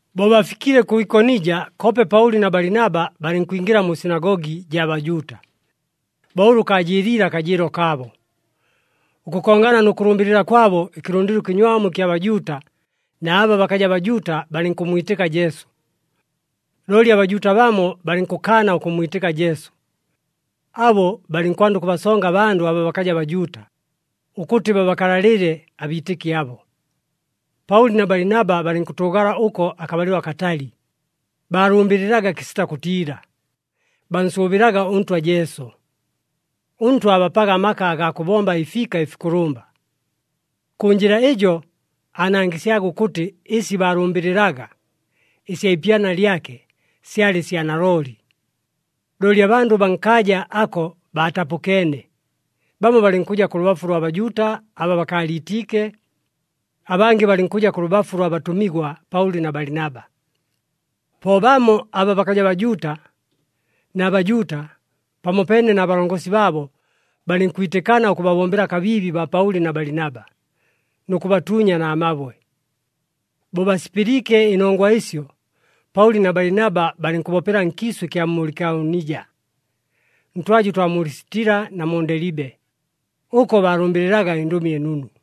Bo bafikile kʉ Ikonija, koope Paʉli na Balinaba balɨnkwingɨla mu sinagogi jaa Bajuuta, bo ʉlʉ kaajɨɨliile akajɨɨlo kaabo. Ʉkʉkongana nʉ kʉlʉmbɨlɨla kwabo, ɨkɨlʉndɨlo ɨkɨnywamu ɨkya Bajuuta na aba bakaja Bajuuta balɨnkʉmmwitɨka Jesu. Looli aBajuuta bamo balɨnkʉkaana ʉkʉmmwitɨka Jesu. Abo balɨnkwanda ʉkʉbasonga abandʉ aba bakaja Bajuuta, ʉkʉtɨ babakalalɨle abiitɨki abo. Paʉli na Balinaba balɨnkʉtʉʉgala ʉko akabalɨlo akatali, baalʉmbɨlɨlaga kɨsita kʉtiila, bansʉʉbɨlaga ʉNtwa Jesu. ɄNtwa aabapaga amaka agaa kʉbomba ɨfiika ɨfikʉlʉmba. Kʉ njɨla ɨjo aanangɨsyaga ʉkʉtɨ ɨsi baalʉmbɨlɨlaga, ɨsya ipyana lyake, syalɨ sya nalooli. Looli abandʉ baa nkaaja ako baatapʉkeene, bamo balɨnkʉja kʉ lʉbafu lwa Bajuuta aba bakaaliitiike, abangɨ balɨnkʉja kʉ lʉbafu lwa batʉmigwa Paʉli na Balinaba. Po bamo aba bakaja Bajuuta na Bajuuta, pamopeene na balongosi baabo, balɨnkwitɨkana ʉkʉbabombela kabiibi baa Paʉli na Balinaba, nʉ kʉbatuunya na mabwe. Bo basipɨliike ɨnongwa ɨsyo, Paʉli na Balinaba balɨnkʉbopela nkiisʉ ɨkya mu Likaonija, ntwaja ʉtwa mu Lisitila na mu Ndelibe. Ʉko baalʉmbɨlɨlaga ɨNdʉmi ɨNunu.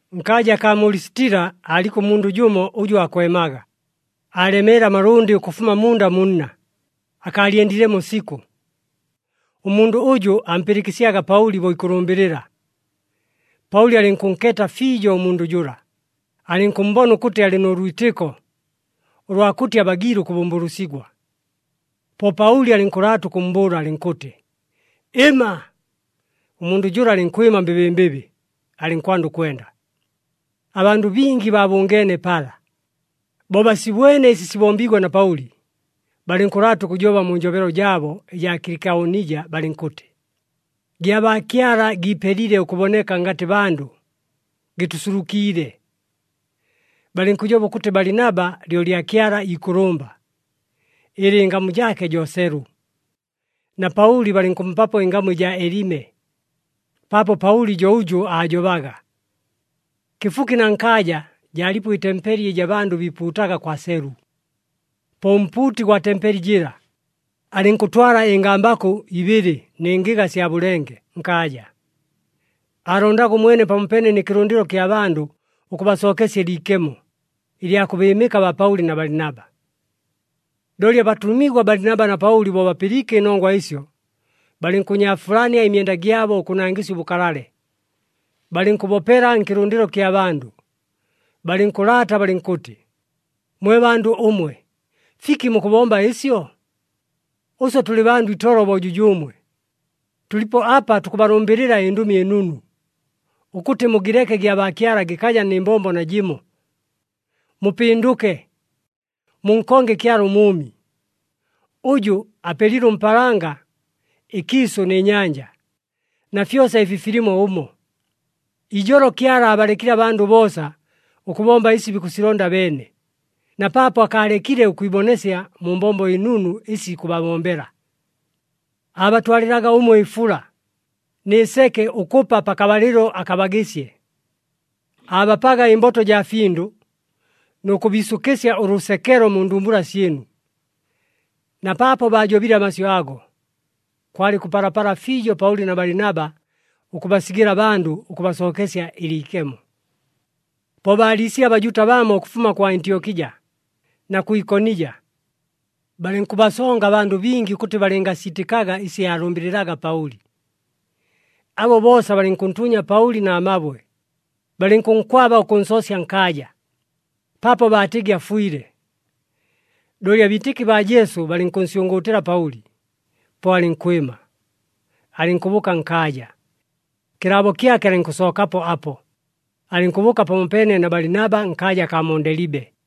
Nkaaja akaa mu Lisitila, aaliko ʉmundʉ jʉmo ʉjʉ aakwemaga, aalemeele amalʉndɨ ʉkʉfuma munda mu nna, akaalyendilemo sikʉ. Ʉmundʉ ʉjʉ ampɨlɨkɨsyaga Paʉli bo ikʉlʉmbɨlɨla. Paʉli alɨnkʉnkeeta fiijo ʉmundʉ jʉla, alɨnkʉmmbona ʉkʉtɨ alɨ nʉ lwitɨko, ʉlwa kʉtɨ abagiile ʉkʉbʉmbʉlʉsigwa. Po Paʉli alɨnkʉlaata ʉkʉmmbʉʉla alɨnkʉtɨ, “Ɨma!” Ʉmundʉ jʉla alɨnkwɨma mbɨbɨmbɨbɨ, alɨnkwanda ʉkwenda. Abandʉ bingi baabʉngeene pala. Bo basibwene ɨsi sibombiigwe na Paʉli, balɨnkʉlaata ʉkʉjoba mu njobelo jaabo ɨjaa Kɨlikaonija, balɨnkʉtɨ, “Gyabaakyala giipelile ʉkʉboneka ngatɨ bandʉ, gɨtʉsulukiile!” Balɨnkʉjoba ʉkʉtɨ, Balinaba lyo lyakyala ikʉlʉmba, ɨlɨ ɨngamu jaake jo Selu, na Paʉli balɨnkʉmpapo ɨngamu ɨjaa Elime, paapo Paʉli jo ʉjʉ aajobaga. Kɨfuki na nkaaja, jaalipo ɨtempeli ɨjɨ abandʉ biipuutaga kwa Selu. Po ʉmpuuti gwa tempeli jɨla, alɨnkʉtwala ɨngambakʉ ibɨlɨ nɨ ngɨga sya bʉlenge nkaaja. Aalondaga ʉmwene pamopeene nɨ kɨlʉndɨlo kya bandʉ, ʉkʉbasookesya ɨliikemo ɨlya kʉbɨɨmɨka baa Paʉli na Balinaba. Looli abatʉmigwa Balinaba na Paʉli, bo bapɨliike ɨnongwa ɨsyo, balɨnkʉnyaafulania ɨmyenda gyabo ʉkʉnangɨsya ʉbʉkalale, balɨnkʉbopela nkɨlʉndɨlo kya bandʉ, balɨnkʉlaata balɨnkʉtɨ, “Mwe bandʉ ʉmwe, fiki mukʉbomba ɨsyo? Ʉswe tʉlɨ bandʉ itolo bo jʉjʉʉmwe. Tʉlipo apa tukʉbalʉmbɨlɨla ɨNdʉmi ɨNunu, ʉkʉtɨ mugɨleke gyabaakyala gɨkaja nɨ mbombo najɨmo. Mupɨndʉke, munkonge Kyala ʉMʉʉmi, ʉjʉ apelile ʉmpaalanga, ɨkiisʉ nɨ nyanja, na fyosa ɨfi filimo ʉmo. Ijolo Kyala aabalekile abandʉ boosa, ʉkʉbomba ɨsi bikʉsilonda abeene, na paapo akaalekile ʉkwibonesya mu mbombo ɨnunu ɨsi ikʉbabombela. Aabatwalɨlaga ʉmwe ɨfula, nɨ seke ʉkʉpa pakabalɨlo akabagɨsye. Aabapaga ɨmboto jaa findʉ nʉ kʉbiisʉkɨsya ʉlʉsekelo mu ndumbula syɨnu.” Na paapo baajobile amasyʉ ago, kwalɨ kʉpalapala fiijo Paʉli na Balinaba ʉkʉbasigɨla abandʉ ʉkʉbasookesya ɨliikemo. Po baaliisile aBajuuta bamo ʉkʉfuma kʉ Antyokija na kʉ Ikonija, balɨnkʉbasonga abandʉ bingi ʉkʉtɨ balɨngasiitɨkaga ɨsi aalʉmbɨlɨlaga Paʉli. Abo boosa balɨnkʉntuunya Paʉli na mabwe, balɨnkʉnkwaba ʉkʉnsoosya nkaaja, paapo baatɨgɨ afwile. Looli abiitɨki baa Jesu balɨnkʉnsyʉngʉʉtɨlɨla Paʉli, po alɨnkwɨma, alɨnkʉbʉʉka nkaaja. Kɨlaabo kyake alɨnkʉsookapo apo, alɨnkʉbʉʉka pamopeene na Balinaba nkaaja akaa mu Ndelibe.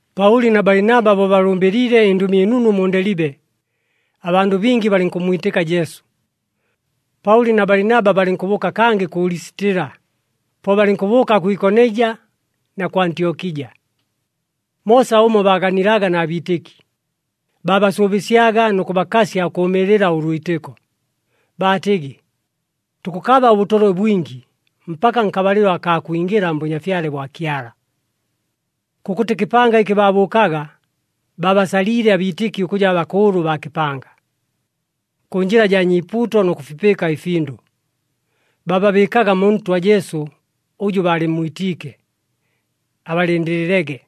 Paʉli na Balinaba bo balʉmbɨliile ɨNdʉmi ɨNunu mu Ndelibe, abandʉ bingi balɨnkʉmmwitɨka Jesu. Paʉli na Balinaba balɨnkʉbʉʉka kangɨ kʉ Lisitila, po balɨnkʉbʉʉka kʉ Ikonija na kʉ Antyokija. Moosa ʉmo, baaganilaga na biitɨki, baabasʉʉbɨsyaga nʉ kʉbakasya ʉkʉʉmɨɨlɨla ʉlwitɨko, baatɨgɨ, “Tukʉkaba ʉbʉtolwe bwingi, mpaka nkabalɨlo akaa kwingɨla mBʉnyafyale bwa Kyala.” Kʉkʉtɨ kɨpanga ɨkɨ baabʉʉkaga, baabasaliile abiitɨki ʉkʉja bakʉʉlʉ baa kɨpanga. Kʉ njɨla jaa nyiipuuto nʉ kʉfipɨɨka ɨfindʉ, baababɨɨkaga mu Ntwa Jesu ʉjʉ baalɨmmwitiike, abalɨndɨlɨlege.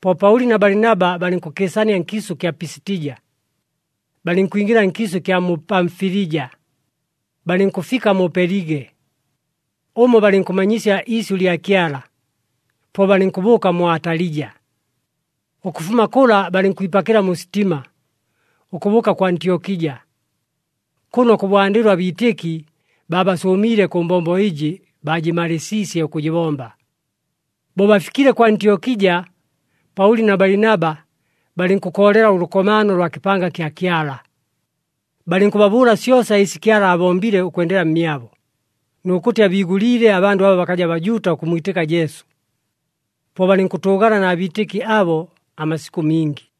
Po Paʉli na Balinaba balɨnkʉkɨɨsania nkiisʉ kya Pisitija, balɨnkwingɨla nkiisʉ ɨkya mu Pamfilija, balɨnkʉfika mu Pelige. Ʉmo balɨnkʉmanyisya iisyʉ lya Kyala, po balɨnkʉbʉʉka mu Atalija. Ʉkʉfuma kʉla balɨnkwipakɨla mu sitima, ʉkʉbʉʉka kʉ Antyokija, kʉno kʉbwandɨlo abiitɨki baabasʉʉmiile kʉ mbombo ɨjɨ baajɨmalɨɨsiisye ʉkʉjɨbomba. Bo bafikile kʉ Antyokija, Paʉli na Balinaba balɨnkʉkoolela ʉlʉkomaano lwa kɨpanga kya Kyala, balɨnkʉbabʉʉla syosa ɨsi Kyala aabombile ʉkwendela mmyabo, nʉ kʉtɨ abiigʉliile abandʉ aba bakaja Bajuuta ʉkʉmmwitɨka Jesu. Po balɨnkʉtʉʉgala na biitɨki abo amasikʉ mingi.